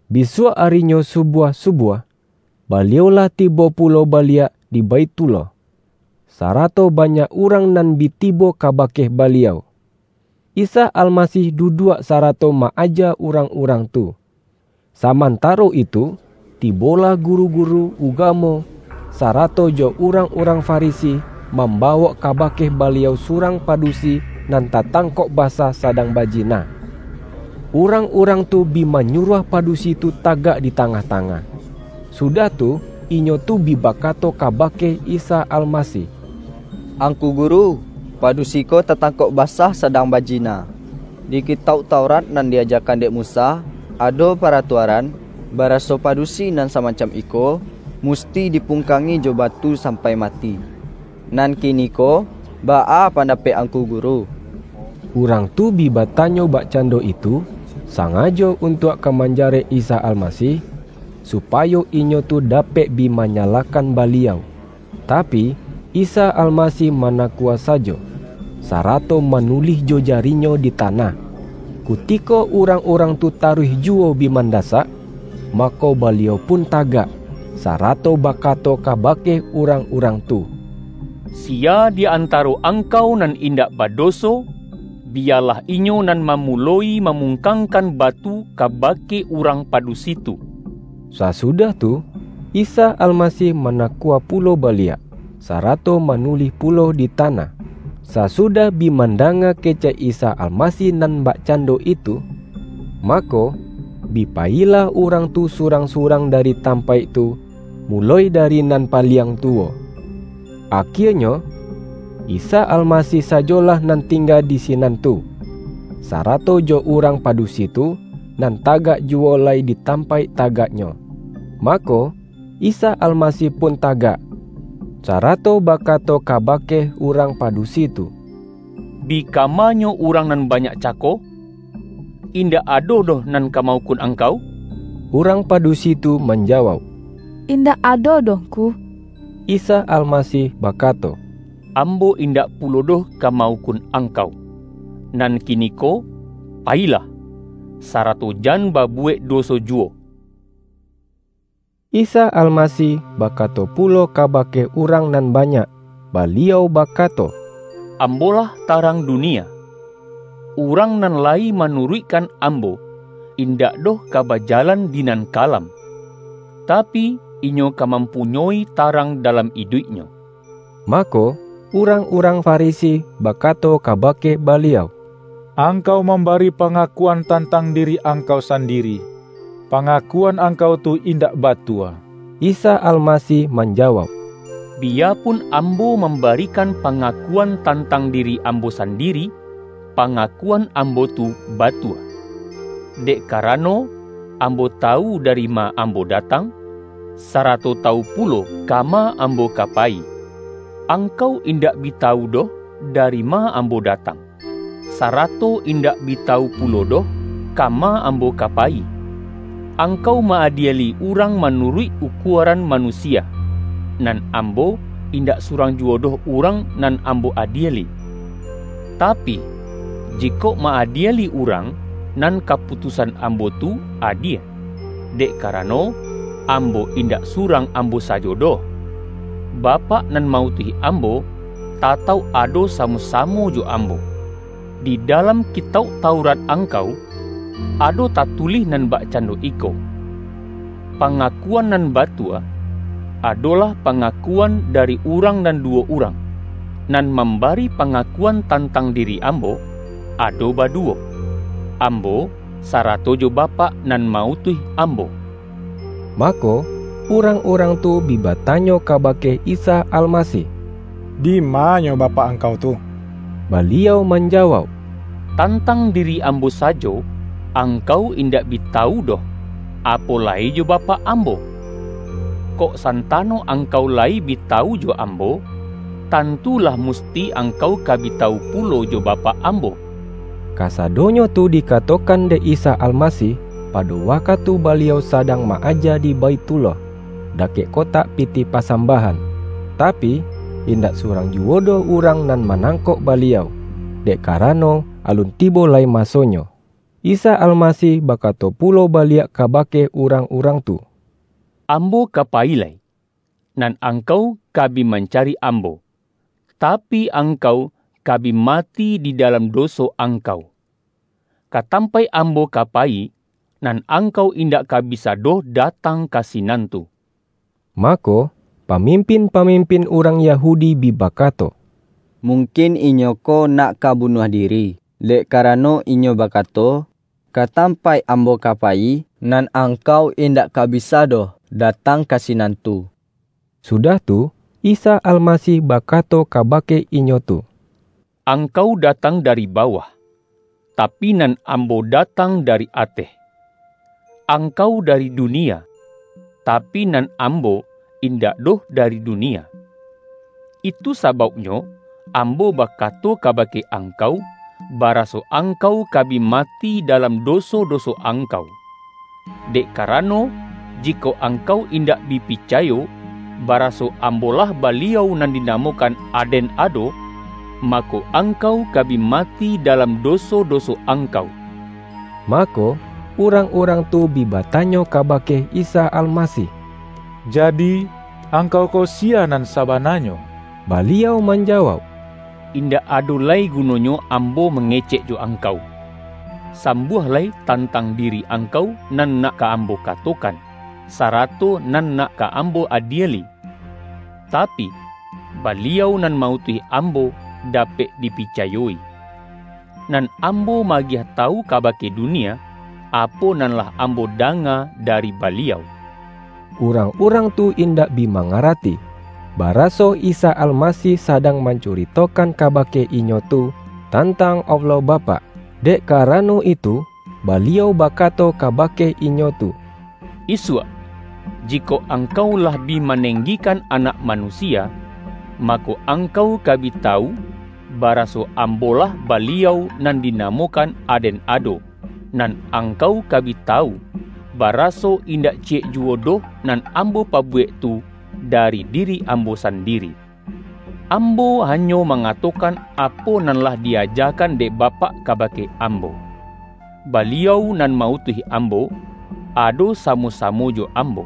Bisuak arinyo subuah-subuah, Baliau lah tibo pulo baliak di Baithullah, sarato banyak urang nan bi tibo kabake Baliau. Isa Alma-sih duduak, sarato ma-aja urang-urang tu. Samantaro itu, tibolah guru-guru ugamo, sarato jo urang-urang Farisi, mambawok kabake Baliau surang padu-si nan tatangkok basah sadang bajina. Urang-urang tu bi manyuruah padusi tu tagak di tangah-tangah, sudah tu, inyo tu bi bakato kabake Isa Almasih,”Angku Guru, padusi ko tatangkok ba-sah sadang bajina. Di Kitauk Taurat nan di-ajakan dek Musa, ado paratua-ran, baraso padusi nan samacam iko, musti dipungkangi jo batu sampai ma-ti. Nan kiniko baa pandapek Angku Guru?” Urang tu bi batanyo bakcan-do itu, sangajo untuak ka manjarek Isa Almasih, supayo inyo tu dapek bi manyalahkan Baliau. Tapi, Isa Almasih manakua sajo, sarato manulih jo jari-Nyo di tanah. Kutiko urang-urang tu taruih juwo bi mandasak, mako Ba-liau pun tagak, sarato bakato kabake urang-urang tu,”Siya di antaro ang-kau nan indak badoso, biyalah inyo nan mamuloi mamungkangkan batu kabake urang padusi tu.” Sasudah tu, Isa Almasih manakua pulo baliak, sarato manulih pulo di tanah. Sasu-dah bi mandanga kecek Isa Almasih nan bakcando itu, mako, bi payilah urang tu surang-surang dari tampaik tu, muloi dari nan paliang tuwo. Akie-nyo, Isa Almasih sajolah nan tingga di sinan tu, sarato jo urang padusi tu, nan tagak juwo lai di tampaik tagak-nyo. Mako, Isa Almasih pun tagak, sarato bakato kabake urang padusi tu,”Bi kamanyo urang nan banyak ca-ko? Indak ado doh nan ka ma-ukun angkau?” Urang padusi tu manjawauk,”In-dak ado doh Ngku.” Isa Almasih bakato,”Ambo indak pulo doh ka ma-ukun angkau. Nan kiniko payilah, sarato jan babuwek doso juwo.”] Isa Almasih bakato pulo kaba-ke urang nan banyak, Baliau bakato,”Ambo-lah tarang dunia. Urang nan layi manuruikkan Ambo, indak doh ka bajalan di nan kalam, tapi, inyo ka mampunyoi tarang dalam iduiknyo.” Mako, urang-urang Farisi bakato kabake Baliau,”Angkau mambari pa-ngakuan tantang diri Angkau sandiri, pangakuan Angkau tu indak batua.” Isa Almasih manjawauk,”Biya-pun Ambo mambarikan pangakuan tantang diri Ambo sandiri, pangaku-an Ambo tu batua. Dek karano, Ambo tawu dari ma Ambo datang, sarato ta-wu pulo kama Ambo ka payi. Angkau indak bi tawu doh dari ma Ambo da-tang, sarato indak bi tawu pulo doh, kama Ambo ka payi. Angkau ma-adieli urang manuruik ukuaran ma-nusia. Nan Ambo, indak surang juwo doh urang nan Ambo adieli. Tapi, jikok ma-adieli urang, nan kaputus-an Ambo tu adie, dek karano, Ambo indak surang Ambo sajo doh. Bapak nan ma-utuih Ambo, tatauk ado sa-mo-samo jo Ambo. Di dalam Ki-tauk Taurat angkau, ado tatulih nan bakcando iko: Pangakuan nan batua, adolah, pangakuan dari urang nan duwo urang. Nan mambari panga-kuan tantang diri Ambo, ado badu-wo Ambo, sarato jo Bapak nan ma-utuih Ambo.” Mako, urang-urang tu bi batanyo kabake Isa Almasih,”Dima-Nyo Ba-pak Angkau tu?” Baliau manjawauk,”Tantang diri Ambo sajo, angkau indak bi tawu doh, apo lai jo Bapak Ambo. Kok santano angkau layi bi tawu jo Ambo, tantu, lah musti angkau ka bi tawu pulo jo Bapak Ambo.” Kasadonyo tu dikatokan dek Isa Almasih, pado wakatu Baliau sadang ma-aja di Baithullah, dakek kotak pitih pasambahan. Tapi, indak surang juwo doh urang nan manangkok Baliau, dek karano, alun tibo lai masonyo. Isa Almasih bakato pulo baliak ka-bake urang-urang tu,”Ambo ka payi lai, nan angkau ka bi mancari Ambo, tapi, angkau ka bi mati di dalam do-so angkau. Ka tampaik Ambo ka pa-yi, nan angkau indak ka bisa doh da-tang ka sinan tu.” Mako, pamimpin-pamimpin urang Yahudi bi bakato,”Mungkin Inyo ko nak ka bunuah diri, dek karano Inyo bakato, ’Ka tampaik Ambo ka payi, nan angkau indak ka bisa doh datang ka sinan tu.’” Sudah tu, Isa Almasih bakato ka-bake inyo tu,”Angkau datang dari ba-wah, tapi, nan Ambo datang dari ateh. Angkau dari dunia, tapi, nan Ambo in-dak doh dari dunia. Itu sabauknyo Ambo bakato kabake angkau, bara-so angkau ka bi mati dalam doso-do-so angkau. Dek karano, jikok angkau indak bi picayo, baraso, ’Ambo-lah Baliau nan dinamokan ADEN ADO’, mako, angkau ka bi mati dalam do-so-doso angkau.” Mako, urang-urang tu bi batanyo kabake Isa Almasih,”Jadi, Angkau ko siya nan sabananyo?” Baliau manjawauk,”Indak ado lai gunonyo Ambo mangecek jo angkau! Sambuah lai tantang diri angkau nan nak ka Ambo katokan, sarato nan nak ka Ambo adieli. Tapi, Baliau nan ma-utuih Ambo dapek dipicayoi. Nan Ambo ma-agiah tawu kabake dunia, apo nan lah Ambo danga dari Baliau.” Urang-urang tu indak bi mangara-ti, baraso Isa Almasih sadang mancu-ritokan kabake inyo tu tantang Allah Bapak. Dek karano itu, Baliau ba-kato kabake inyo tu,”Isuak, jikok angkau lah bi manenggikan Anak Manusia, mako, angkau ka bi tawu, baraso ’Am-bo-lah Baliau nan dinamokan ADEN ADO’, nan angkau ka bi tawu, bara-so indak ciyek juwo doh nan Ambo pabuwek tu, dari diri Ambo sandiri. Ambo hanyo mangatokan apo nan lah di-ajakan dek Bapak kabake Ambo. Baliau nan ma-utuih Ambo, ado sa-mo-samo jo Ambo.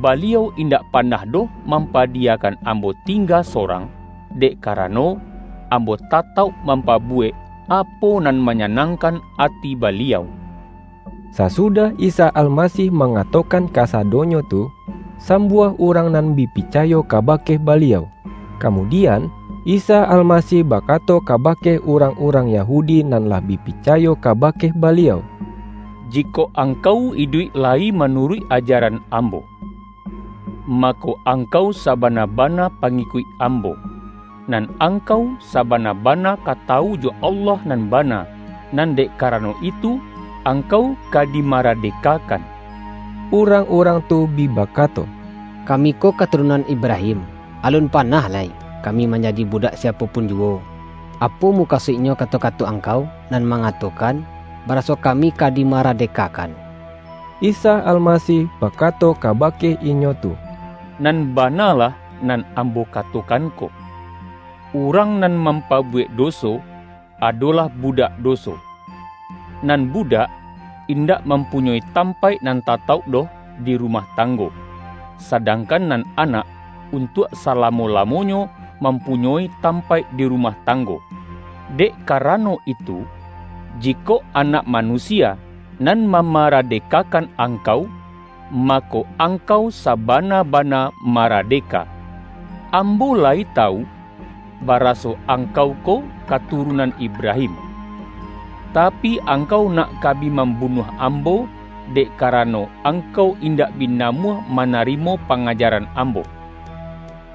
Baliau indak pa-nah doh mampadiyakan Ambo ting-ga sorang, dek karano, Ambo tatauk mampabuwek apo nan manyanang-kan ati Baliau.” Sasudah Isa Almasih mangatokan kasadonyo tu, sambuah urang nan bi picayo kabake Baliau. Kamudian, Isa Almasih bakato ka-bake urang-urang Yahudi nan lah bi pi-cayo kabake Baliau,”Jikok angkau iduik layi manuruik ajaran Ambo, mako, angkau sabana-bana pangikuik Ambo, nan angkau sabana-bana ka tawu jo Allah nan bana, nan dek karano itu, angkau ka dimaradekakan.” Urang-urang tu bi bakato,”Kami ko katurunan Ibrahim, alun panah lai kami manjadi budak siapo pun juwo! Apo mukasuiknyo kato-kato Angkau nan mangatokan: ’baraso kami ka di-maradekakan'?” Isa Almasih bakato kabake inyo tu,”Nan bana lah nan Ambo katokan ko. Urang nan mampabuwek doso, ado-lah budak doso. Nan budak, indak mampunyoi tampaik nan tatauk doh di rumah tanggo, sadangkan nan anak, untuak salamo-lamonyo mampunyoi tampaik di rumah tanggo. Dek ka-rano itu, jikok Anak Manusia nan ma-maradekakan angkau, mako, angkau sabana-bana maradeka. Ambo layi tawu, baraso angkau ko katurunan Ibrahim. Tapi, angkau nak ka bi mambunuah Ambo, dek karano, angkau indak bi namuah manarimo panga-jaran Ambo.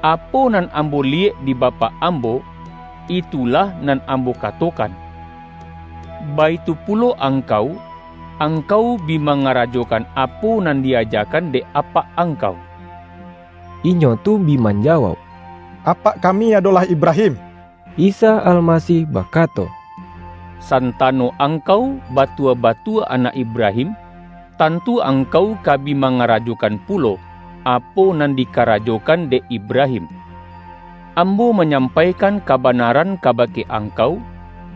Apo nan Ambo liyek di Bapak Ambo, itulah nan Ambo ka-tokan. Baitu pulo angkau, angkau bi mangarajokan apo nan di-ajakan dek apak angkau.” Inyo tu bi manjawauk,”Apak ka-mi adolah Ibrahim.” Isa Almasih bakato,”Santano ang-kau, batua-batua anak Ibrahim, tantu angkau ka bi mangarajokan pulo, apo nan dikarajokan dek Ibrahim. Ambo manyampaikan kabanaran kabake ang-kau,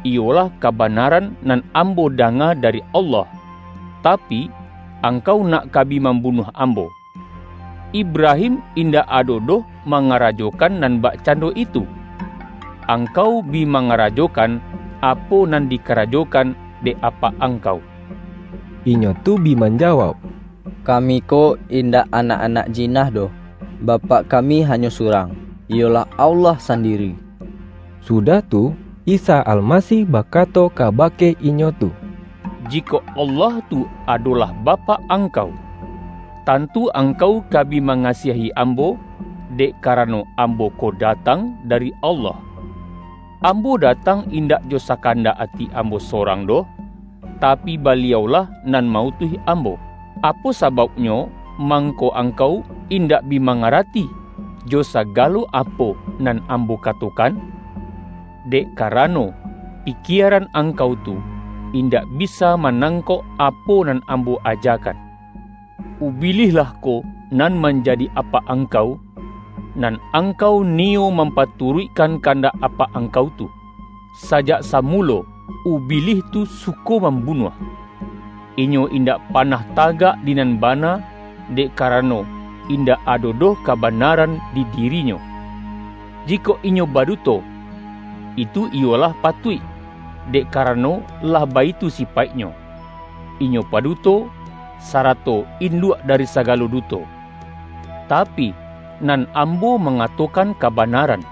iyolah kabanaran nan Ambo da-nga dari Allah, tapi, angkau nak ka bi mambunuah Ambo. Ibrahim indak ado doh mangarajokan nan bakcando itu! Angkau bi mangarajokan apo nan dikarajokan dek apak angkau.” Inyo tu bi manjawauk,”Kami ko in-dak anak-anak jina doh. Bapak kami hanyo surang, iyolah Allah sandiri.” Sudah tu, Isa Almasih bakato ka-bake inyo tu,”Jikok Allah tu adolah Bapak angkau, tantu angkau ka bi ma-ngasiahi Ambo, dek karano, Ambo ko datang dari Allah. Ambo datang in-dak jo sakandak ati Ambo sorang doh, tapi, Baliau-lah nan ma-utuih Ambo. Apo sabauknyo mangko angkau in-dak bi mangarati, jo sagalo apo nan Ambo katokan? Dek karano, pikieran angkau tu indak bisa manangkok apo nan Ambo ajakan. Ubilih lah ko nan manjadi apak angkau, nan angkau ni-yo mampaturuikkan kandak apak ang-kau tu. Sajak samulo Ubilih tu suko mambunuah. Inyo indak panah tagak di nan bana, dek karano, indak ado doh kabanaran di dirinyo. Jikok inyo baduto, itu iyo lah patuik, dek karano lah baitu sipaiknyo. Inyo paduto, sa-rato induak dari sagalo duto. Tapi, nan Ambo mangatokan kabanaran,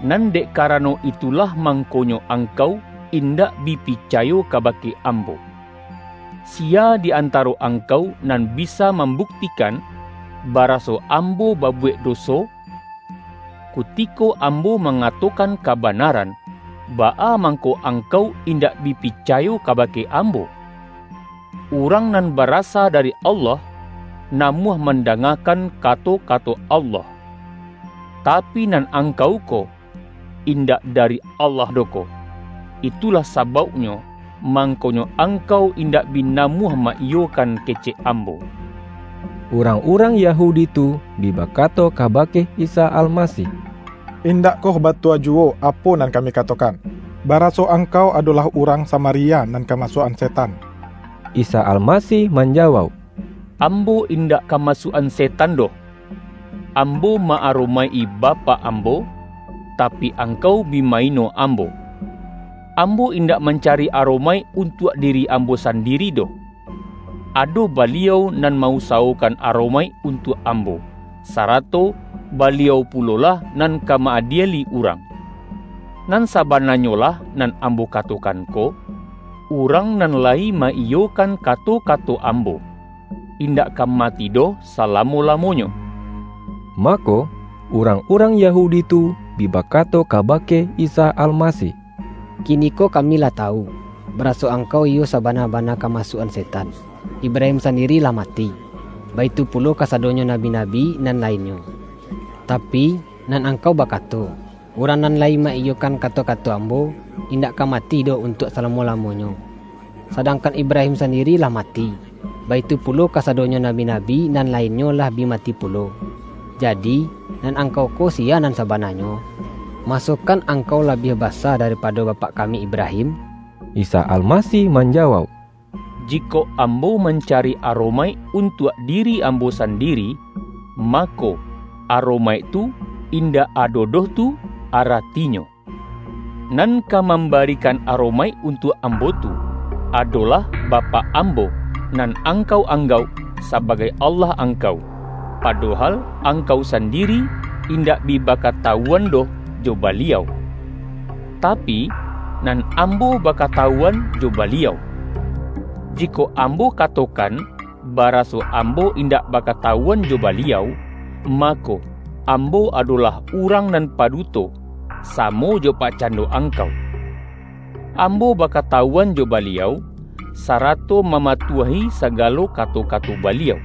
nan dek karano itulah, mangkonyo angkau indak bi picayo kabake Am-bo. Siya di antaro angkau nan bisa mambuktikan, baraso Ambo babu-wek doso? Kutiko Ambo mangatokan kabanaran, baa mangko angkau in-dak bi picayo kabake Ambo? Urang nan barasa dari Allah, namuah man-dangakan kato-kato Allah. Tapi, nan angkau ko, indak dari Allah doh ko, itulah sabauknyo, mangkonyo ang-kau indak bi namuah ma-iyokan ke-cek Ambo.” Urang-urang Yahudi tu bi baka-to kabake Isa Almasih,”Indakkoh ba-tua juwo apo nan kami katokan, bara-so Angkau adolah urang Samaria nan kamasuak-an setan?” Isa Almasih manjawauk,”Ambo indak kamasuak-an setan doh. Ambo ma-aromaik-i Bapak Ambo, tapi, ang-kau bi ma-ino Ambo. Ambo indak mancari aromaik untuak diri Ambo sandiri doh. Ado Baliau nan ma-usa-wokan aromaik untuak Ambo, sarato Baliau pulolah nan ka ma-adieli urang. Nan sabananyolah nan Ambo kato-kan ko, urang nan layi ma-iyokan ka-to-kato Ambo, indak ka mati doh sa-lamo-lamonyo.” Mako, urang-urang Yahudi tu bi bakato kabake Isa Almasih,”Kiniko kami lah tawu, baraso Angkau iyo sa-bana-bana kamasuak-an setan! Ibra-him sandiri lah mati, baitu pulo ka-sadonyo nabi-nabi nan lainnyo. Tapi, nan Angkau bakato, ’Urang nan layi ma-iyokan kato-kato Ambo, indak ka mati doh untuak salamo-lamonyo.’ Sadangkan Ibrahim sandiri lah ma-ti, baitu pulo kasadonyo nabi-nabi nan lainnyo lah bi mati pulo, jadi, nan Ang-kau ko siya nan sabananyo? Masokan Angkau labiah basa daripado bapak kami Ibrahim!” Isa Almasih manjawauk,”Jikok Ambo mancari aromaik untuak diri Ambo sandiri, mako, aromaik tu indak ado doh tu aratinyo. Nan ka mambari-kan aromaik untuak Ambo tu, adolah Bapak Ambo, nan angkau anggauk sabagai Allah angkau, padohal ang-kau sandiri indak bi bakatawuan doh jo Baliau. Tapi, nan Ambo bakatawu-an jo Baliau. Jikok Ambo katokan ba-raso Ambo indak bakatawuan jo Ba-liau, mako, Ambo adolah urang nan paduto, samo jo bakcando angkau. Ambo bakatawuan jo Baliau, sarato mamatuahi sagalo kato-kato Baliau.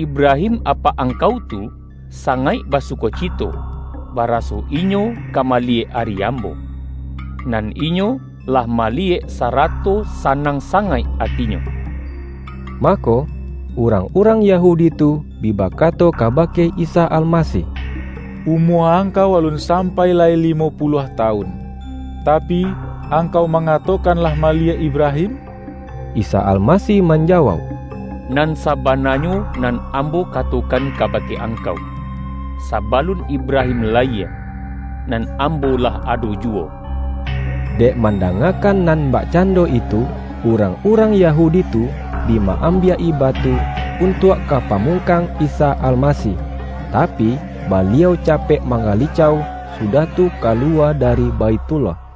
Ibrahim, apak angkau tu, sangaik basukocito, baraso inyo ka maliyek ari Ambo. Nan inyo lah maliyek, sa-rato sanang sangaik atinyo!” Mako, urang-urang Yahudi tu bi bakato kabake Isa Almasih,”Umua Angkau alun sampai lai limo puluah tawun, tapi, Angkau mangatokan lah maliyek Ibrahim?” Isa Almasih manjawauk,”Nan sa-bananyo nan Ambo katokan kabake angkau: Sabalun Ibrahim layie, nan Ambo lah ado juwo.” Dek mandangakan nan bakcan-do itu, urang-urang Yahudi tu bi ma-ambiak-i batu, untuak ka pamung-kang Isa Almasih, tapi, Baliau capek manggalicau, sudah tu kaluwa dari Baithullah. YAHYA